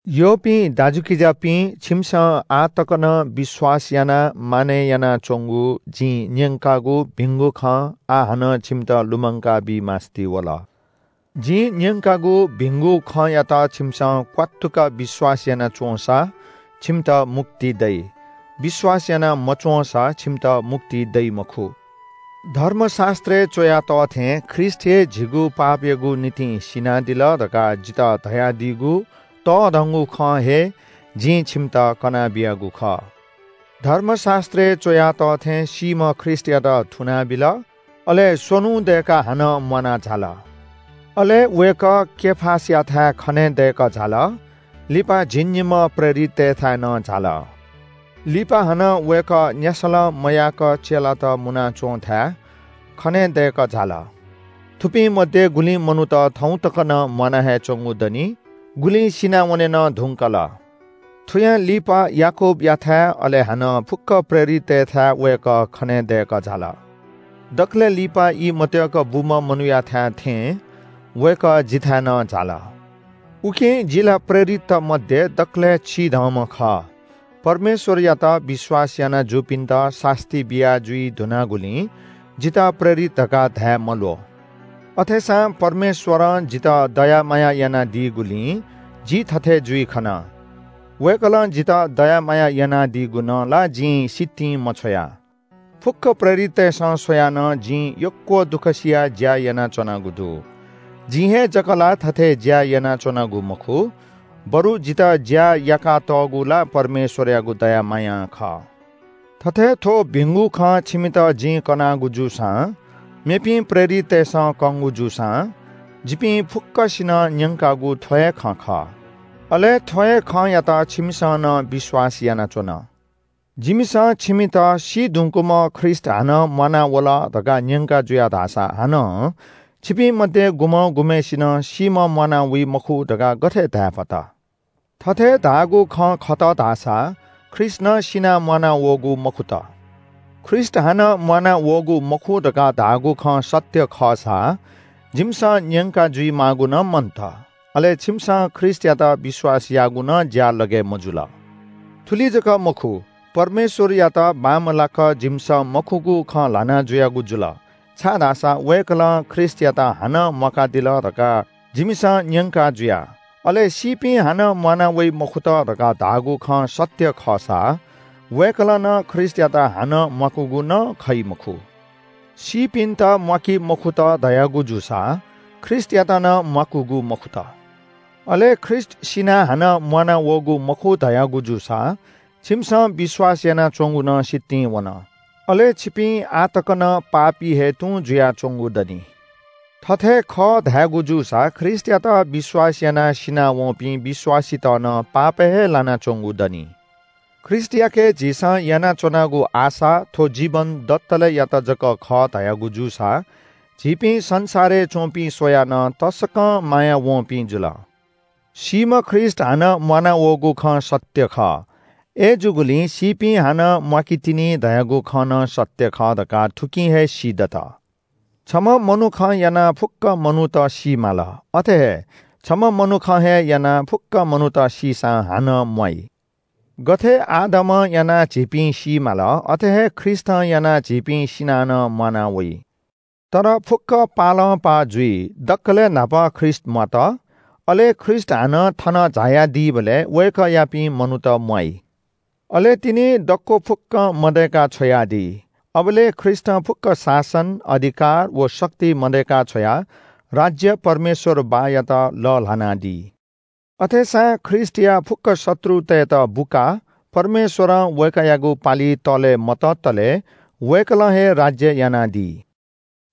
यःपिं दाजुकिजापिं, छिमिसं आः तक नं विश्‍वास यानाः मानय् यानाच्‍वंगु जिं न्‍यंकागु भिंगु खँ आः हानं छिमित लुमंकाबी मास्‍ति वल। जिं न्‍यंकागु भिंगु खँयात छिमिसं क्‍वात्तुक विश्‍वास याना च्‍वंसा छिमित मुक्ति दइ, विश्‍वास याना मच्‍वंसा छिमित मुक्ति दइ मखु। धर्मशास्‍त्रय् च्‍वया तः थें ख्रीष्‍ट हे झीगु पापयागु निंतिं सिनादिल धकाः जितः धयादीगु तःधगुं खँ हे जिं छिमित कना बियागु खः। धर्मशास्‍त्रय् च्‍वया तः थें सीम्‍ह ख्रीष्‍टयात थुनाबिल, अले स्‍वन्‍हु दय्‌काः हानं म्‍वाना झाल। अले वय्‌कः केफासयाथाय् खनेदय्‌कः झाल। लिपा झिंनिम्‍ह प्रेरिततय्‌थाय् नं झाल। लिपा हानं वय्‌कः न्‍यासलं मयाक चेलात मुनाच्‍वंथाय् खनेदय्‌कः झाल। थुपिं मध्‍ये गुलिं मनूत थौं तक नं म्‍वाना हे च्‍वंगु दनि, गुलिं सिनावने नं धुंकल। थुयां लिपा याकूबयाथाय्, अले हानं फुक्‍क प्रेरिततय्‌थाय् वय्‌कः खनेदय्‌कः झाल। दकलय् लिपा ई मत्य्‌क बूम्‍ह मनूयाथाय् थें वय्‌कः जिथाय् नं झाल। उकिं जि ला प्रेरितत मध्‍ये दकलय् चिधंम्‍ह खः। परमेश्‍वरयात विश्‍वास याना जूपिन्‍त सास्‍ती बियाजुइ धुनागुलिं जितः प्रेरित धकाः धाये मल्‍वः। अथेसां परमेश्‍वरं जितः दया माया यानादीगुलिं जि थथे जुइ खन। वय्‌कलं जितः दया माया यानादीगु नं ला जिं सितिं मछ्वया। फुक्‍क प्रेरिततय्‌सं स्‍वयाः नं जिं यक्‍व दुःख सियाः ज्‍या यानाच्‍वनागु दु। जिं हे जक ला थथे ज्‍या यानाच्‍वनागु मखु, बरु जितः ज्‍या याकातःगु ला परमेश्‍वरयागु दया मायां खः। थथे थ्‍व भिंगु खँ छिमित जिं कनागु जूसां, मेपिं प्रेरिततय्‌सं कंगु जूसां जिपिं फुक्‍कसिनं न्‍यंकागु थ्‍व हे खँ खः। अले थ्‍व हे खँयात छिमिसं नं विश्‍वास यानाच्‍वन। जिमिसं छिमित “सी धुंकूम्‍ह ख्रीष्‍ट हानं म्‍वानावल” धकाः न्‍यंका जुया धाःसा हानं छिपिं मध्‍ये गुम्‍हं गुम्‍हय्‌सिनं सीम्‍ह म्‍वाना वइ मखु धकाः गथे धायेफत? थथे धाःगु खँ खत धाःसा ख्रीष्‍ट नं सिनाः म्‍वानावःगु मखुत। ख्रीष्‍ट हानं म्‍वानावःगु मखु धकाः धाःगु खँ सत्‍य खःसा जिमिसं न्‍यंका जुइमाःगु नं मन्‍त, अले छिमिसं ख्रीष्‍टयात विश्‍वास याःगु नं ज्‍यालगय् मजुल। थुलि जक मखु, परमेश्‍वरयात बांमलाक जिमिसं मखुगु खँ ल्‍हाना जुयागु जुल, छाय्‌धाःसा वय्‌कलं ख्रीष्‍टयात हानं म्‍वाकादिल धकाः जिमिसं न्‍यंका जुया। अले सीपिं हानं म्‍वाना वइ मखुत धकाः धाःगु खँ सत्‍य खःसा वय्‌कलं नं ख्रीष्‍टयात हानं म्‍वाकूगु नं खइ मखु। सीपिन्‍त म्‍वाकी मखुत धयागु जूसा ख्रीष्‍टयात नं म्‍वाकूगु मखुत। अले ख्रीष्‍ट सिनाः हानं म्‍वानावःगु मखु धयागु जूसा छिमिसं विश्‍वास यानाच्‍वंगु नं सितिं वन, अले छिपिं आः तक नं पापी हे तुं जुयाच्‍वंगु दनि। थथे खः धयागु जूसा ख्रीष्‍टयात विश्‍वास यानाः सिनावंपिं विश्‍वासीत नं पापय् हे लानाच्‍वंगु दनी। ख्रीष्‍टयाके झीसं यानाच्‍वनागु आशा थ्‍व जीवन दतलेयात जक खः धयागु जूसा झीपिं संसारय् च्‍वंपिं स्‍वयाः नं तसकं मायावंपिं जुल। सीम्‍ह ख्रीष्‍ट हानं म्‍वानावःगु खँ सत्‍य खः। अय्‌जूगुलिं सीपिं हानं म्‍वाकीतिनि धयागु खँ नं सत्‍य खः धकाः थुकिं हे सीदत। छम्‍ह मनुखं यानाः फुक्‍क मनूत सी माल, अथे हे छम्‍ह मनुखं हे यानाः फुक्‍क मनूत सीसां हानं म्‍वाइ। गथे आदमं यानाः झीपिं सी माल, अथे हे ख्रीष्‍टं यानाः झीपिं सिनाः नं म्‍वाना वइ। तर फुक्‍क पालंपाः जुइ। दकलय् न्‍हापा ख्रीष्‍ट म्‍वात, अले ख्रीष्‍ट हानं थन झायादीबलय् वय्‌कःयापिं मनूत म्‍वाइ। अले तिनि दक्‍व फुक्‍कं मदय्‌का छ्वयादी। अबलय् ख्रीष्‍टं फुक्‍क शासन, अधिकार व शक्ति मदय्‌का छ्वयाः राज्‍य परमेश्‍वर बाःयात लःल्‍हानादी। अथेसां ख्रीष्‍टया फुक्‍क शत्रुतय्‌त बुकाः परमेश्‍वरं वय्‌कःयागु पालि तःले मततले वय्‌कलं हे राज्‍य यानादी।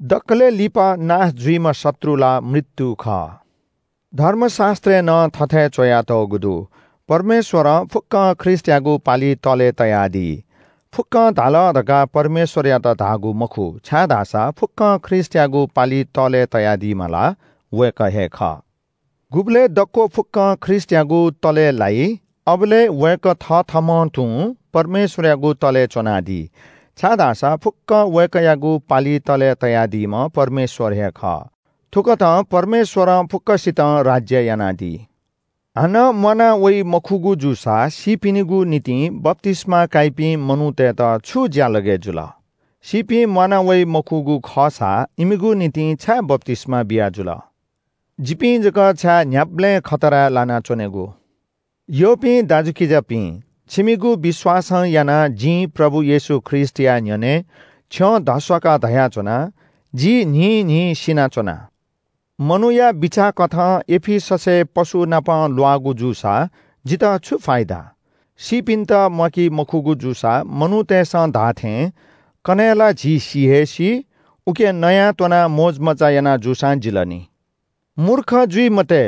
दकलय् लिपा नाश जुइम्‍ह शत्रु ला “मृत्‍यु” खः। धर्मशास्‍त्रय् नं थथे च्‍वयातःगु दु – “परमेश्‍वरं फुक्‍कं ख्रीष्‍टयागु पालि तःले तयादी।” “फुक्‍कं” धाल धकाः परमेश्‍वरयात धाःगु मखु, छाय्‌धाःसा फुक्‍कं ख्रीष्‍टयागु पालि तःले तयादीम्‍ह ला वय्‌कः हे खः। गुबलय् दक्‍व फुक्‍कं ख्रीष्‍टयागु तःले लाइ, अबलय् वय्‌कः थथःम्‍हं तुं परमेश्‍वरयागु तःले च्‍वनादी, छाय्‌धाःसा फुक्‍कं वय्‌कःयागु पालि तःले तयादीम्‍ह परमेश्‍वर हे खः। थुकथं परमेश्‍वरं फुक्‍कसितं राज्‍य यानादी। हानं म्‍वाना वइ मखुगु जूसा सीपिनिगु निंतिं बप्‍तिस्‍मा काइपिं मनूतय्‌त छु ज्‍यालगय् जुल? सीपिं म्‍वाना वइ मखुगु खःसा इमिगु निंतिं छाय् बप्‍तिस्‍मा बियाजुल? जिपिं जक छाय् न्‍ह्याबलें खतराय् लाना च्‍वनेगु? यःपिं दाजुकिजापिं, छिमिगु विश्‍वासं यानाः जिं प्रभु येशू ख्रीष्‍टया न्‍ह्यःने छ्यं धस्‍वाकाः धयाच्‍वना – “जि न्‍हिन्‍हिं सिना च्‍वना।” मनूया बिचाःकथं एफिससय् पशुनाप ल्‍वाःगु जूसा जितः छु फाइदा? सीपिन्‍त म्‍वाकी मखुगु जूसा मनूतय्‌सं धाःथें – “कन्‍हय् ला झी सि हे सी, उकिं नयाःत्‍वनाः मोजमज्‍जा याना जूसां जिल नि।” मूर्ख जुइ मते,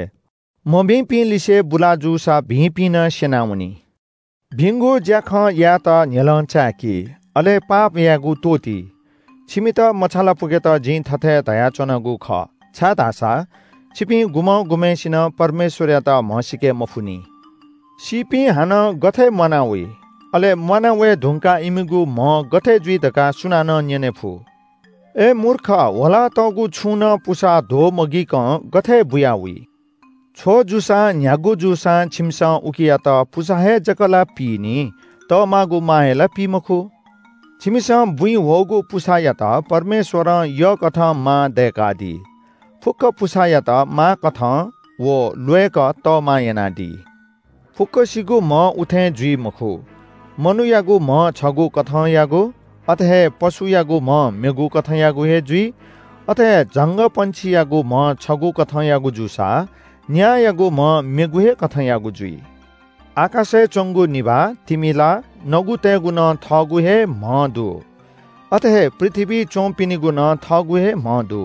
“मभिंपिं लिसे बुला जूसा भिंपिं नं स्‍यनावनी।” भिंगु ज्‍याखँ यायेत न्‍ह्यलं चाय्‌कि, अले पाप यायेगु त्‍वःति। छिमित मछालापुकेत जिं थथे धयाच्‍वनागु खः, छाय्‌धाःसा छिपिं गुम्‍हं गुम्‍हय्‌सिनं परमेश्‍वरयात म्‍हसीके मफुनि। सीपिं हानं गथे म्‍वाना वइ, अले म्‍वाना वये धुंकाः इमिगु म्‍ह गथे जुइ धकाः सुनानं न्‍यनेफु। अय् मूर्ख – ह्वलातःगु छुं नं पुसा ध्‍वमगिकं गथे बुया वइ? छ्व जूसां, न्‍ह्यागु जूसां छिमिसं उकियात पुसा हे जक ला पीगु खः, तःमागु मा हे ला पी मखु। छिमिसं बुँइ ह्वःगु पुसायात परमेश्‍वरं यःकथं मा दय्‌कादी। फुक्‍क पुसायात माकथं व ल्‍वय्‌क तःमा यानादी। फुक्‍कसिगु म्‍ह उथें जुइ मखु। मनूयागु म्‍ह छगू कथंयागु, अथे हे पशुयागु म्‍ह मेगु कथंयागु हे जुइ। अथे हे झंगःपंक्षियागु म्‍ह छगू कथंयागु जूसा, न्‍यायागु म्‍ह मेगु हे कथंयागु जुइ। आकाशय् च्‍वंगु निभाः, तिमिला, नगुतय्‌गु नं थःगु हे म्‍ह दु। अथे हे पृथ्‍वीइ च्‍वंपिनिगु नं थःगु हे म्‍ह दु।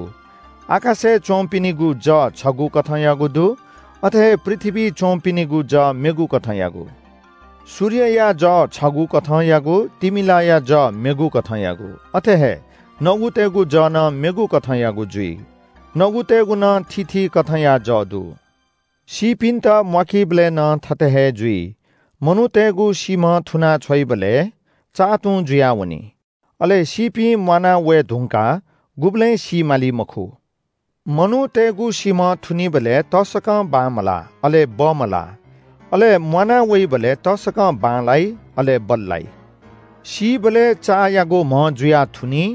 आकाशय् च्‍वंपिनिगु जः छगू कथंयागु दु। अथे हे पृथ्‍वीइ च्‍वंपिनिगु जः मेगु कथंयागु। सूर्यया जः छगू कथंयागु, तिमिलाया जः मेगु कथंयागु। अथे हे नगुतय्‌गु जः नं मेगु कथंयागु जुइ। नगुतय् नं थीथी कथंया जः दु। सीपिन्‍त म्‍वाकीबलय् नं थथे हे जुइ। मनूतय्‌गु सीम्‍ह थुना छ्वइबलय् चा तुं जुयावनी। अले सीपिं म्‍वाना वये धुंकाः गुबलें सी माली मखु। मनूतय्‌गु सीम्‍ह थुनीबलय् तसकं बांमलाः अले बमलाः। अले म्‍वाना वइबलय् तसकं बांलाइ अले बल्‍लाइ। सीबलय् चायागु म्‍ह जुयाः थुनी,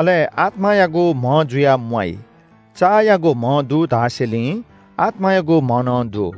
अले आत्‍मायागु म्‍ह जुयाः म्‍वाइ। चायागु म्‍ह दु धासेंलि आत्‍मायागु म्‍ह नं दु।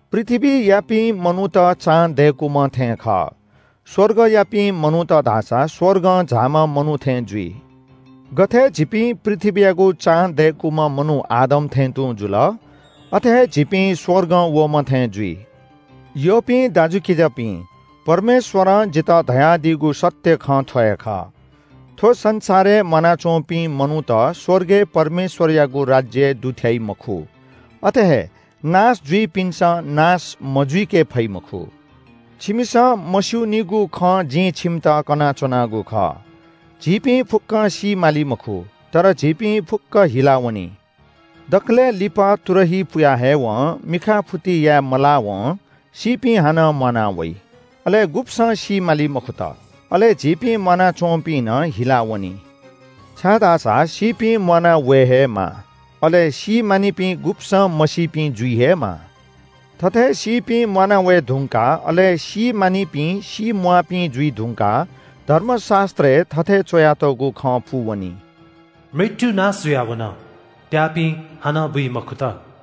पृथ्‍वीयापिं मनूत चां दय्‌कूम्‍ह थें खः स्‍वर्गयापिं मनूत धाःसा स्‍वर्गं झाःम्‍ह मनू थें जुइ। गथे झीपिं पृथ्‍वीयागु चां दय्‌कूम्‍ह मनू आदम थें तुं जुल, अथे हे झीपिं स्‍वर्गं वःम्‍ह थें जुइ। यःपिं दाजुकिजापिं, परमेश्‍वरं जितः धयादीगु सत्‍य खँ थ्‍व हे खः। थ्‍व संसारय् म्‍वानाच्‍वंपिं मनूत स्‍वर्गय् परमेश्‍वरयागु राज्‍यय् दुथ्‍याइ मखु। अथे हे नाश जुइपिन्‍सं नाश मजुइके फइ मखु। छिमिसं मस्‍यूनिगु खँ जिं छिमित कनाच्‍वनागु खः। झीपिं फुक्‍कं सी माली मखु। तर झीपिं फुक्‍क हिलावनी। दकलय् लिपा तुरही पुया हयेवं मिखाफुति याये मलावं सीपिं हानं म्‍वाना वइ, अले गुब्‍सं सी माली मखुत। अले झीपिं म्‍वानाच्‍वंपिं नं हिलावनी। छाय्‌धाःसा सीपिं म्‍वाना वये हे माः, अले सीमानिपिं गुब्‍सं मसीपिं जुइ हे माः। थथे सीपिं म्‍वाना वये धुंकाः अले सी माःनिपिं सीम्‍वाःपिं जुइ धुंकाः धर्मशास्‍त्रय् थथे च्‍वयातःगु खँ पूवनी – “मृत्‍यु नाश जुयावन, त्‍याःपिं हानं बुइ मखुत।”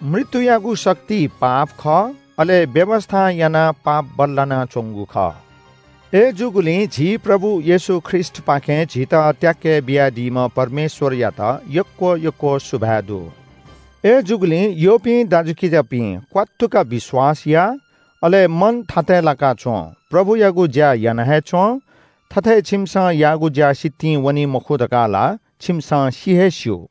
मृत्‍युयागु शक्ति पाप खः। अले व्‍यवस्‍थां यानाः पाप बल्‍लानाच्‍वंगु खः। अय्‌जूगुलिं झी प्रभु येशू ख्रीष्‍टपाखें झीत त्‍याके बियादीम्‍ह परमेश्‍वरयात यक्‍व यक्‍व सुभाय् दु। अय्‌जूगुलिं यःपिं दाजुकिजापिं, क्‍वात्तुक विश्‍वास या, अले मन थातय् लाकाः च्‍वँ। प्रभुयागु ज्‍या याना हे च्‍वँ। थथे छिमिसं याःगु ज्‍या सितिं वनी मखु धकाः ला छिमिसं सि हे स्‍यू।